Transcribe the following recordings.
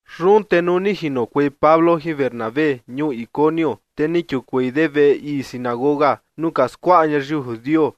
Yun te nuu ni jinokuei Pablo jin Bernabé ñuu Iconio, te ni kiukuei de veꞌe ii sinagoga nuu ka skuaꞌa ñayiu judio,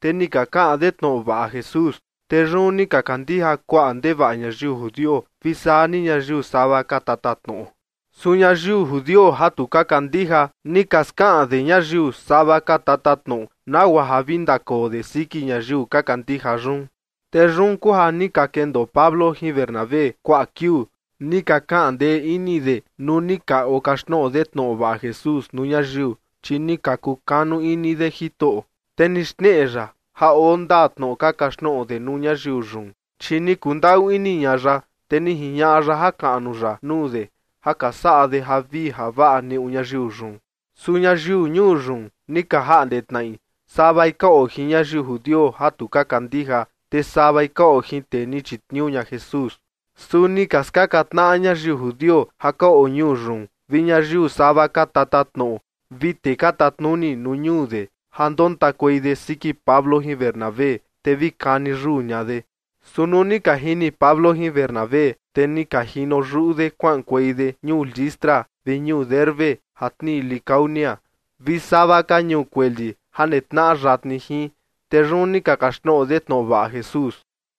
te ni ka kaꞌan de tnoꞌo vaꞌa Jesús. Te yun ni ka kandija kuaꞌa ndevaꞌa ñayiu judio vi saa ni ñayiu sava ka tatatnoꞌo. Su ñayiu judio ja tu ka kandija, ni ka skaꞌan de ñayiu sava ka tatatnoꞌo nagua ja vi ndakoo de siki ñayiu ka kandija yun. Te yun kuu ja ni ka kendoo Pablo jin Bernabé kuaꞌa kiuu, ni ka kaꞌan ndee ini de nuu ni ka okaxtnoꞌo de tnoꞌo vaꞌa Jesús nuu ñayiu. Chi ni ka kukanu ini de Jitoꞌo, te ni xneꞌe ya ja oo ndaa tnoꞌo ka kaxtnoꞌo de nuu ñayiu yun, chi ni kundaꞌu ini ña ya, te ni jiñaꞌa ya jakaꞌnu ya nuu de, ja ka saꞌa de javii javaꞌa neꞌu ñayiu yun. Su ñayiu ñuu yun ni ka jaꞌnde tnaꞌi, savai ka oo jin ñayiu judio ja tu ka kandija, te savai ka oo jin tee ni chitniuu ña Jesús. Su ni ka skaka tnaꞌa ñayiu judio ja ka oo ñuu yun vi ñayiu sava ka tatatnoꞌo vi tee ka tatnuni nuu ñuu de, ja ndontakuei de siki Pablo jin Bernabé, te vi kani yuu ña de. Su nuu ni ka jini Pablo jin Bernabé, te ni ka jino yuꞌu de kuaꞌankuei de ñuu Listra vi ñuu Derbe ja tnii Licaonia, vi sava ka ñuu kueli ja netnaꞌa yatni jin. Te yun ni ka kaxtnoꞌo de tnoꞌo vaꞌa Jesús.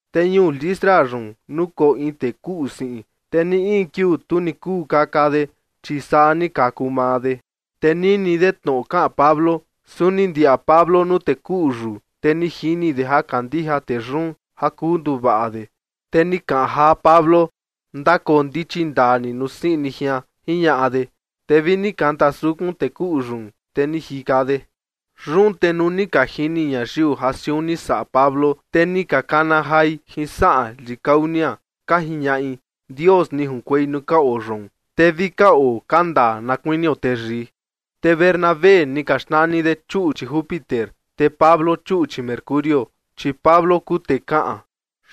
Te ñuu Listra yun nukoo in tee kuꞌu siꞌin. Te ni in kiuu tu ni kuu kaka de, chi saa ni kaku maa de. Te nini de tnoꞌo kaꞌan Pablo. Su ni ndiaꞌa Pablo nuu tee kuꞌu yun, te ni jini de ja kandija tee yun ja kuu nduvaꞌa de. Te ni kaꞌan jaa Pablo: ―Ndakoo ndichi ndaa ni nuu siꞌin ni jian ―jiñaꞌa de. Te vi ni kanta sukun tee kuꞌu yun, te ni jika de. Yun te nuu ni ka jini ñayiu ja siun ni saꞌa Pablo, te ni ka kana jai jin saꞌan Licaonia, ka jiñaꞌi: ―¡Dios ni junkuei nuu ka oo yoon, te vi ka oo ka ndaa na kuinio teyii! Te Bernabé ni ka xnani de chuꞌchi Júpiter, te Pablo chuꞌchi Mercurio, chi Pablo kuu tee kaꞌan.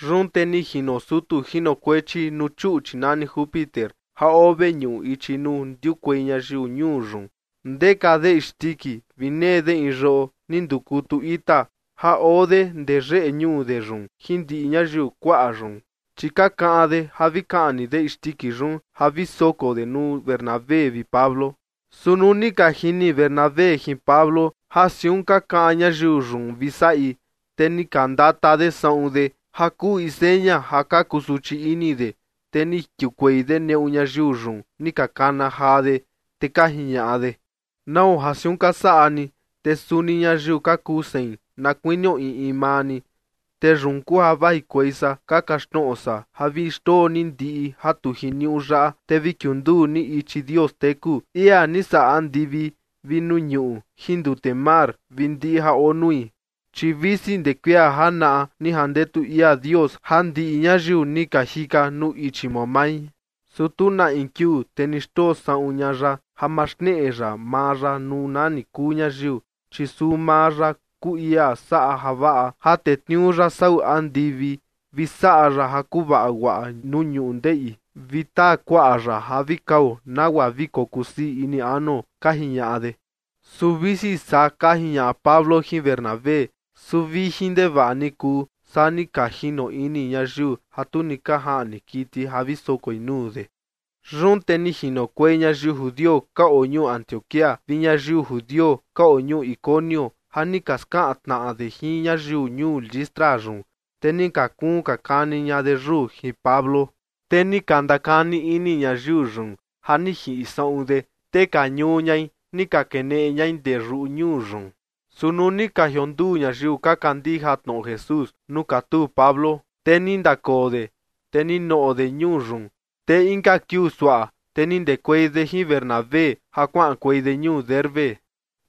Yun te ni jino sutu jinokuechi nuu chuꞌchi nani Júpiter ja oo veñuꞌu ichi nuu ndiukuei ñayiu ñuu yun, ndeka de isndiki vi nee de in yoꞌo ni ndukutu ita ja oo de ndee yeꞌe ñuu de yun jin ndiꞌi ñayiu kuaꞌa yun, chi ka kaꞌan de ja vi kaꞌni de isndiki yun ja vi soko de nuu Bernabé vi Pablo. Su nuu ni ka jini Bernabé jin Pablo ja siun ka kaꞌan ñayiu yun vi saꞌi, te ni ka ndata de saꞌun de ja kuu in seña ja ka kuu suchi ini de, te ni kiukuei de neꞌu ñayiu yun ni ka kana jaa de, te ka jiñaꞌa de: ―¿Nau ja siaꞌa ka saꞌa ni? Te suni ñayiu ka kuu sein na kuinio in in maa ni. Te yun kuu ja vajikuei san ka kaxtnoꞌo san ja vi xndoo ni ndiꞌi ja tu jiniuꞌu yaꞌa, te vi kiunduu ni ichi Dios teku, ia ni saꞌa andivi vi nuu ñuꞌu jin ndute mar vi ndiꞌi ja oo nui. Chi visi ndee kuia janaꞌa ni jandetu ia Dios ja ndiꞌi ñayiu ni ka jika nuu ichi mamai, su tu na in kiuu te ni xndoo saꞌun ña ya ja ma xneꞌe ya maa ya nuu nani kuu ñayiu, chi suu maa ya kuu ia saꞌa javaꞌa ja tetniuu ya sau andivi, vi saꞌa ya ja kuvaa guaꞌa nuu ñundeꞌi, vi taa kuaꞌa ya ja vi kao nagua vi kokusii ini anuo ―ka jiñaꞌa de. Su visi saa ka jiñaꞌa Pablo jin Bernabé, su vijin ndevaꞌa ni kuu, saa ni ka jino ini ñayiu ja tu ni ka jaꞌni kiti ja vi sokoi nuu de. Yun te ni jinokuei ñayiu judio ka oo ñuu Antioquía vi ñayiu judio ka oo ñuu Iconio ja ni ka skaꞌan tnaꞌa de jin ñayiu ñuu Listra yun. Te ni ka kuun ka kani ña de yuu jin Pablo. Te ni ka ndakani ini ñayiu yun ja ni jiꞌi saꞌun de, te ka ñuu ñai, ni ka keneꞌe ñai ndee yuꞌu ñuu yun. Su nuu ni ka jionduu ñayiu ka kandija tnoꞌo Jesús nuu katuu Pablo, te ni ndakoo de, te ni noꞌo de ñuu yun. Te inka kiuu suaꞌa, te ni ndekuei de jin Bernabé ja kuaꞌankuei de ñuu Derbe.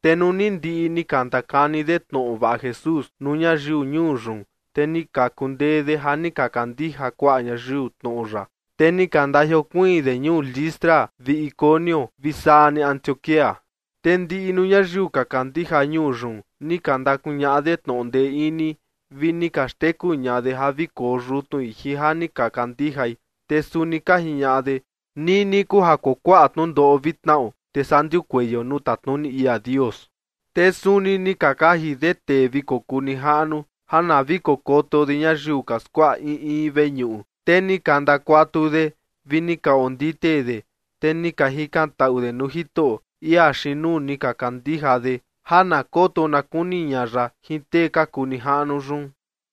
Te nuu ni ndiꞌi ni ka ndakani de tnoꞌo vaꞌa Jesús nuu ñayiu ñuu yun, te ni ka kundee de ja ni ka kandija kuaꞌa ñayiu tnoꞌo ya, te ni ka ndajiokuiin de ñuu Listra vi Iconio vi saa ni Antioquía. Te ndiꞌi nuu ñayiu ka kandija ñuu yun ni ka ndakuñaꞌa de tnoꞌo ndee ini vi ni ka xteku ña de ja vi koo yutnui jin ja ni ka kandijai, te suni ka jiñaꞌa de: ―Nini kuu ja kuakuaꞌa tnundoꞌo vi tnaꞌo, te saa ndiukueio nuu tatnuni ia Dios. Te suni ni ka kaji de tee vi kokuu nijaꞌnu ja na vi kokoto de ñayiu ka skuaꞌa in in veñuꞌu. Te ni ka ndakuatu de vi ni ka ondite de, te ni ka jikantaꞌu de nuu Jitoꞌo, ia xiin nuu ni ka kandija de, ja na koto na kuni ña ya jin tee ka kuu nijaꞌnu yun.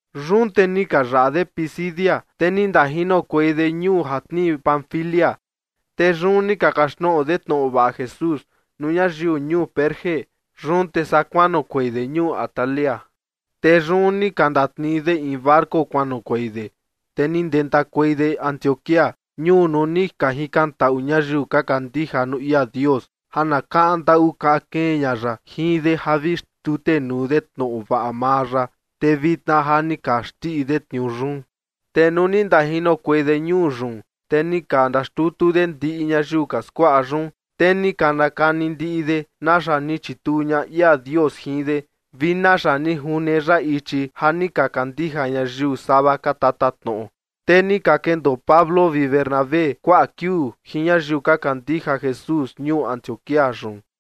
Yun te ni ka yaꞌa de Pisidia, te ni ndajinokuei de ñuu ja tnii Panfilia. Te yun ni ka kaxtnoꞌo de tnoꞌo vaꞌa Jesús nuu ñayiu ñuu Perge. Yun te saa kuanoꞌokuei de ñuu Atalia. Te yun ni ka ndatnii de in barco kuanoꞌokuei de, te ni ndentakuei de Antioquía, ñuu nuu ni ka jikantaꞌu ñayiu ka kandija nuu ia Dios ja na kaꞌan ndaꞌu kaꞌan kee ña ya jin de ja vi xtutenuu de tnoꞌo vaꞌa maa ya, te vitna ja ni ka xndiꞌi de tniuu yun. Te nuu ni ndajinokuei de ñuu yun, te ni ka ndaxtutu de ndiꞌi ñayiu ka skuaꞌa yun, te ni ka ndakani ndiꞌi de naxa ni chituu ña ia Dios jin de, vi naxa ni june ya ichi ja ni ka kandija ñayiu sava ka tatatnoꞌo. Te ni ka kendoo Pablo vi Bernabé kuaꞌa kiuu jin ñayiu ka kandija Jesús ñuu Antioquía yun.